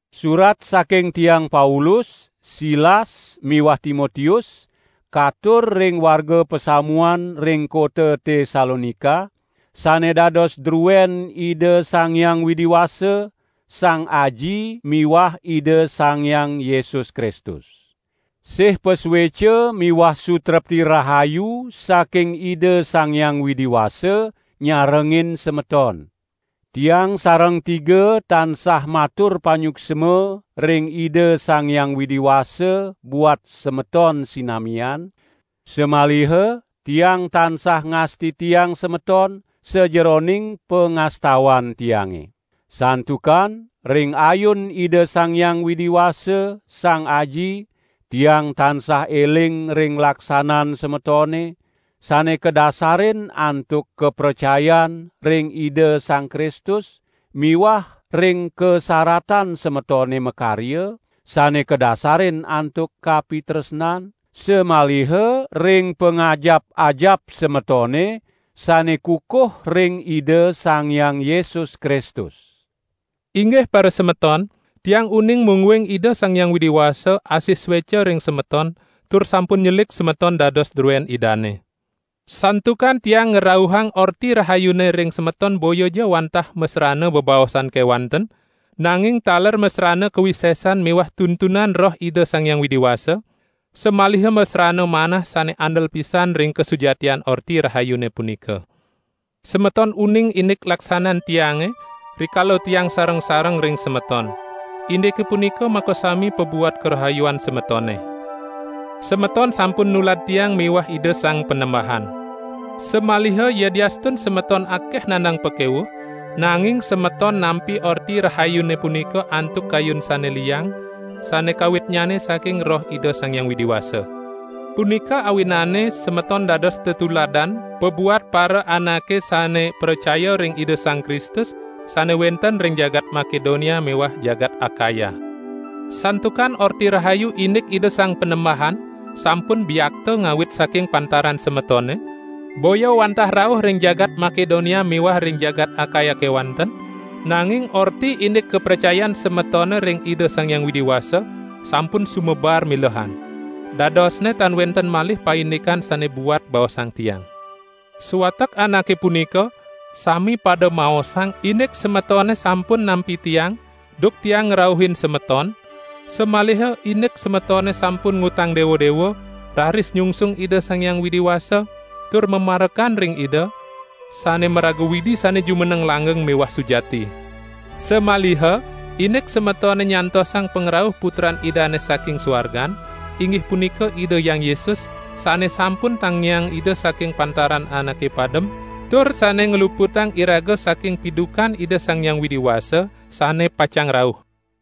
Surat saking tiang Paulus, Silas miwah Timotius katur ring warga pasamuan ring kota Tesalonika, sane dados druen Ida Sang Hyang Widi Wasa, Sang Aji miwah Ida Sang Hyang Yesus Kristus. Sih pasueca miwah sutrepti rahayu saking Ida Sang Hyang Widi Wasa nyarengin semeton. Tiang sareng tiga tansah matur panyuksma ring Ida Sang Hyang Widi Wasa buat semeton sinamian, samaliha tiang tansah ngastitiang semeton sajeroning pangastawan tiange. Santukan ring ayun Ida Sang Hyang Widi Wasa, Sang Aji, tiang tansah eling ring laksanan semetone, sane kadasarin antuk kapracayan ring Ida Sang Kristus miwah ring kasaratan semetone makarya, sane kadasarin antuk kapitresnan, samaliha ring pangajap-ajap semetone sane kukuh ring Ida Sang Hyang Yesus Kristus. Inggih parasemeton, tiang uning mungguing Ida Sang Hyang Widi Wasa asih sueca ring semeton tur sampun nyelik semeton dados druen Idane. Santukan tiang ngrauhang Orti Rahayune ring semeton boyaja wantah masrana bebaosan kewanten, nanging taler masrana kawisesan miwah tuntunan Roh Ida Sang Hyang Widi Wasa, samaliha masrana manah sane andel pisan ring kasujatian Orti Rahayune punika! Semeton uning indik laksanan tiange, rikala tiang sareng-sareng ring semeton; indike punika makasami pabuat karahayuan semetone. Semeton sampun nulad tiang miwah Ida Sang Panembahan. Samaliha yadiastun semeton akeh nandang pakewuh, nanging semeton nampi Orti Rahayune punika antuk kayun sane liang, sane kawitnyane saking Roh Ida Sang Hyang Widi Wasa. Punika awinane semeton dados tetuladan pabuat paraanake sane pracaya ring Ida Sang Kristus, sane wenten ring jagat Makedonia miwah jagat Akaya. Santukan Orti Rahayu indik Ida Sang Panembahan sampun biakta ngawit saking pantaran semetone, boya wantah rauh ring jagat Makedonia miwah ring jagat Akaya kewanten, nanging Orti indik kapracayan semetone ring Ida Sang Hyang Widi Wasa sampun sumebar milehan. Dadosne tan wenten malih paindikan sane buat baosang tiang. Sawatek anake punika sami pada maosang indik semetone sampun nampi tiang duk tiang ngrauhin semeton, samaliha indik semetone sampun ngutang dewa-dewa, raris nyungsung Ida Sang Hyang Widi Wasa, tur mamarekan ring Ida sane maraga Widi sane jumeneng langgeng miwah sujati. Samaliha indik semetone nyantosang pangrauh Putran Idane saking suargan, inggih punika Ida Hyang Yesus, sane sampun tangiang Ida saking pantaran anake padem tur sane ngluputang iraga saking pidukan Ida Sang Hyang Widi Wasa sane pacang rauh.